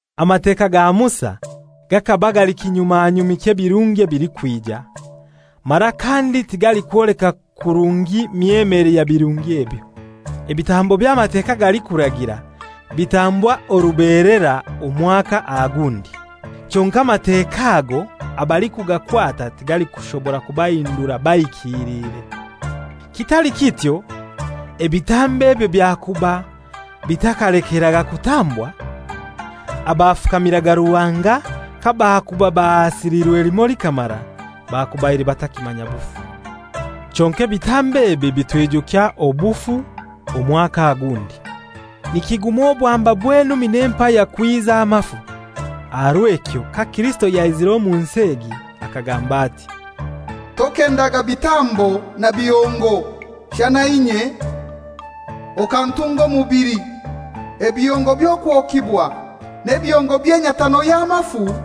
Amateka ga Musa gakaba gakaba gali kinyumanyumi ky'ebirungi ebilikwija, mara kandi tigalikwoleka kurungi myemere ya birungi ebyo. Ebitambo eby'Amateka galikuragira bitambwa orubelera omwaka aha gundi. Kyonkai Amateka ago abalikugakwata tigalikushobora kubahindura bahikilire. Kitali kityo ebitambo ebyo byakuba bitakalekeraga kutambwa? Abafukamiraga Ruhanga kabakuuba bahasiliirwe limoi likamara, bakubaire batakimanya bufu. Kyonkai ebitambo ebi bitwijukya obufu omwaka aha gundi. Nikiguma obwamba bw'enumi n'empaya kwiza amafu. Aha rw'ekyo ka Kirisito yaizire omu nsi egi akagamba ati, «Tokendaga bitambo na bihongo, shana inye okantunga omubili. Ebihongo by'okwokibwa n'ebihongo by'enyatano y'amafu,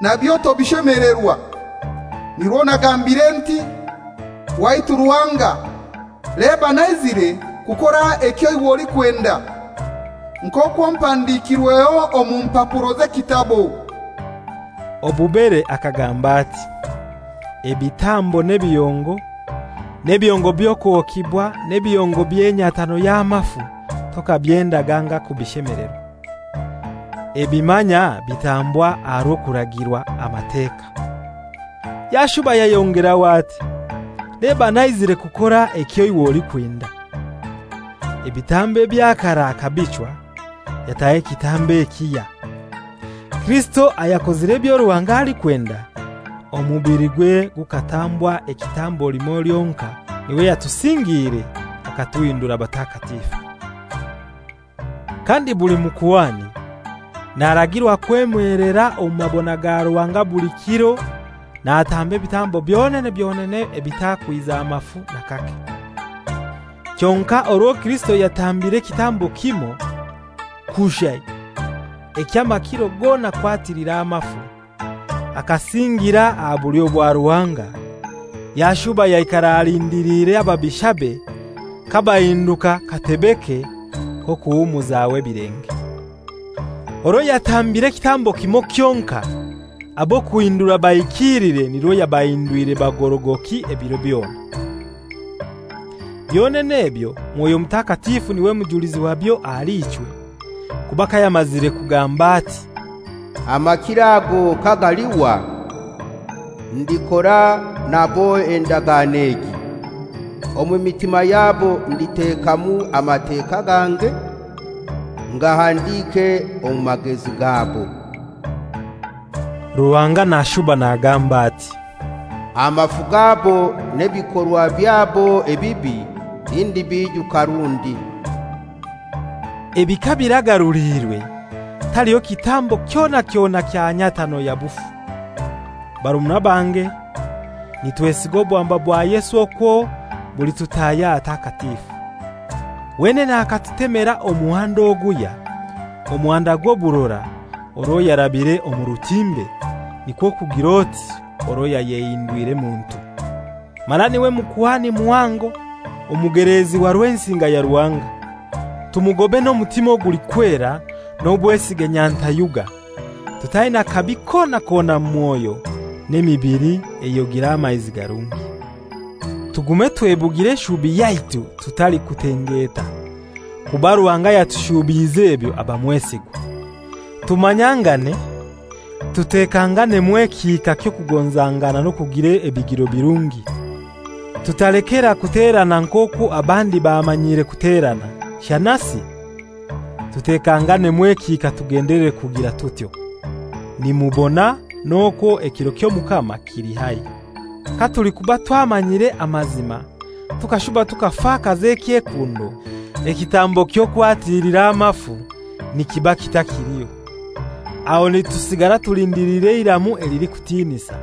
nabyo tobishemelerwa. Nirwo nagambire nti, ‹Waitu Ruhanga, leba naizire kukora ekyo iwe olikwenda,› nk'okwo mpandikirweho omu mpapuro z'ekitabo.» Obubere akagamba ati, «Ebitambo n'ebihongo, n'ebihongo by'okwokibwa n'ebihongo by'enyatano y'amafu tokabyendaga anga kubishemelerwa.» Ebi manya bitambwa aha rw'okuragirwa Amateka. Yashuba yayongeraho ati, «Leba naizire kukora ekyo iwe olikwenda.» Ebitambo ebya karai akabichwa, yataho ekitambo ekihya. Kirisito ayakozire ebyo Ruhanga alikwenda, omubiligwe gukatambwa ekitambo limoi lyonkai, n'iwe yatusingiire akatuhindura batakatifu. Kandi buli mukuhani naragirwa kwemelera omu mabona ga Ruhanga buli kiro natamba ebitambo byonene byonene ebitakwiza mafu n'akake. Kyonkai orwo Kirisito yatambire ekitambo kimoi kushai eky'amakiro gona kwatilira amafu, akasingira aha bulyo bwa Ruhanga, yashuba yaikara alindiliire ababishabe kabahinduka katebeke k'okuhumuzaho ebilenge. Orwo yatambire ekitambo kimoi kyonkai, ab'akuhindura bahikilire nirwo yabahindwire bagorogoki ebiro byona. Byonene ebyo, Mwoyo Mutakatifu n'iwe mujulizi wabyo ahali ichwe; kuba kayamazire kugamba ati, «Amakiro ago kagalihwa, ndikora nabo endagano egi: Omu mitima yabo nditekamu Amateka gange, ngahandike omu magezi gabo.» Ruhanga nashuba nagamba ati, «Amafu gabo n'ebikorwa byabo ebibi tindibiijuka rundi.» Ebi kabiragaruliirwe, taliho kitambo kyona kyona kya nyatano ya bufu. Barumuna bange, nitwesiga obwamba bwa Yesu okwo bulitutahya ahatakatifu. Wenene akatutemera omuhanda oguhya, omuhanda gw'oburora, orwo yarabire omu rutimbe, nikwo kugir'oti orwo yayehindwire muntu. Mara n'iwe Mukuhani Muhango omugeleezi wa Rwensinga ya Ruhanga. Tumugobe n'omutima gulikwera n'obwesige nyantayuga, tutaina kabi kona kona mu mwoyo, n'emibili eyogire amaizi garungi. Tugume twebugire eshubi yaitu tutalikutengeeta, kuba Ruhanga ayatushubiize ebyo aba mwesigwa. Tumanyangane, tutekanganemu ekihika ky'okugonzangana n'okugira ebigiro birungi. Tutalekera kuterana nk'okwo abandi bamanyiire kuterana, shanasi tutekanganemu ekihika tugendelere kugira tutyo. Nimubona n'okwo ekiro ky'Omukama kili haihi. Katulikuba twamanyire amazima tukashuba tukafakaza ekyekundo, ekitambo ky'okwatilira amafu nikiba kitakiliho. Aho nitusigara tulindiliire eiramu elilikutinisa,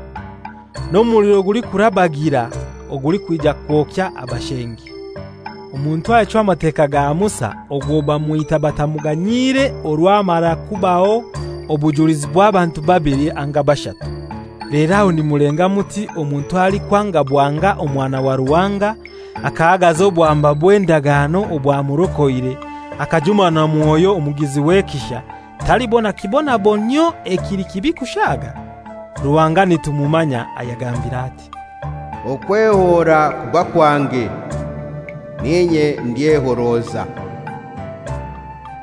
n'omuliro gulikurabagira ogulikwija kwokya abashengi. Omuntu ayachwa Amateka ga Musa ogwo bamwita batamuganyiire orwo hamara kubaho obujulizi bw'abantu babili anga bashatu. Lero aho nimulenga muti omuntu alikwanga bwanga Omwana wa Ruhanga, akahagaza obwamba bw'endagano obwamurokoire, akajuma na Mwoyo omugizi w'ekisha, talibona kibonabonyio ekili kibi kushaaga? Ruhanga nitumumanya ayagambiire ati, «Okwehoora kuba kwange, n'inye ndyehoroza.»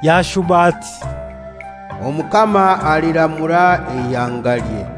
Yashuba ati, «Omukama aliramura eihangalye.»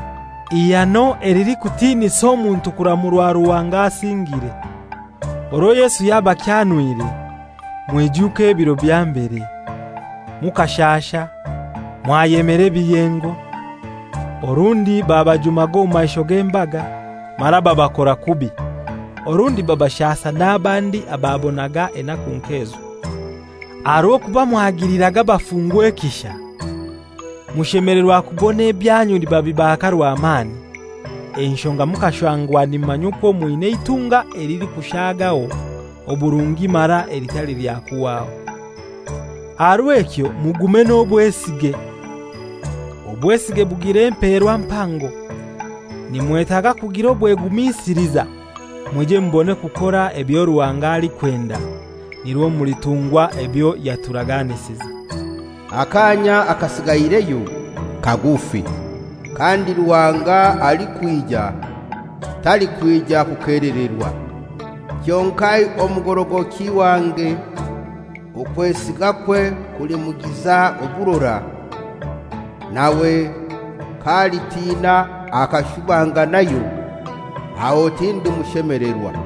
Ihano elilikutinisa omuntu kuramurwa Ruhanga asingire. Orwo Yesu yabakyanwire mwijuke ebiro bya mbere: mukashasha mwayemera ebiyengo; orundi babajumaga omu maisho g'embaga mara babakora kubi, orundi babashasa n'abandi ababonaga enaku nk'ezo. Aha rw'okuba mwagiliraga abafungwa ekisha, mushemelerwa kubona ebyanyu nibabibaaka rwamani, enshonga mukashangwa nimumanya okwo mwina eitunga elilikushagaho oburungi mara elitali lya kuhwaho. Aha rw'ekyo mugume n'obwesige, obwesige bugira emperwa mpango. Nimwetaga kugira obwegumisiliza, mwije mubone kukora ebyo Ruhanga alikwenda, nirwo mulitungwa ebyo yaturaganisize. «Akaanya akasigaireyo kagufi, kandi Ruhanga alikwija talikwija kukelererwa. Kyonkai omugorogoki wange okwesigakwe kulimugiza oburora; nawe k'alitina akashubanganayo aho tindimushemelerwa.»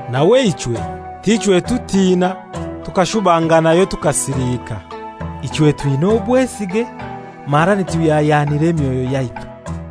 Nawe ichwe t'ichwe tutiina tukashubanganayo tukasiliika. Ichwe twina obwesige mara nituhyahyanira emyoyo yaitu.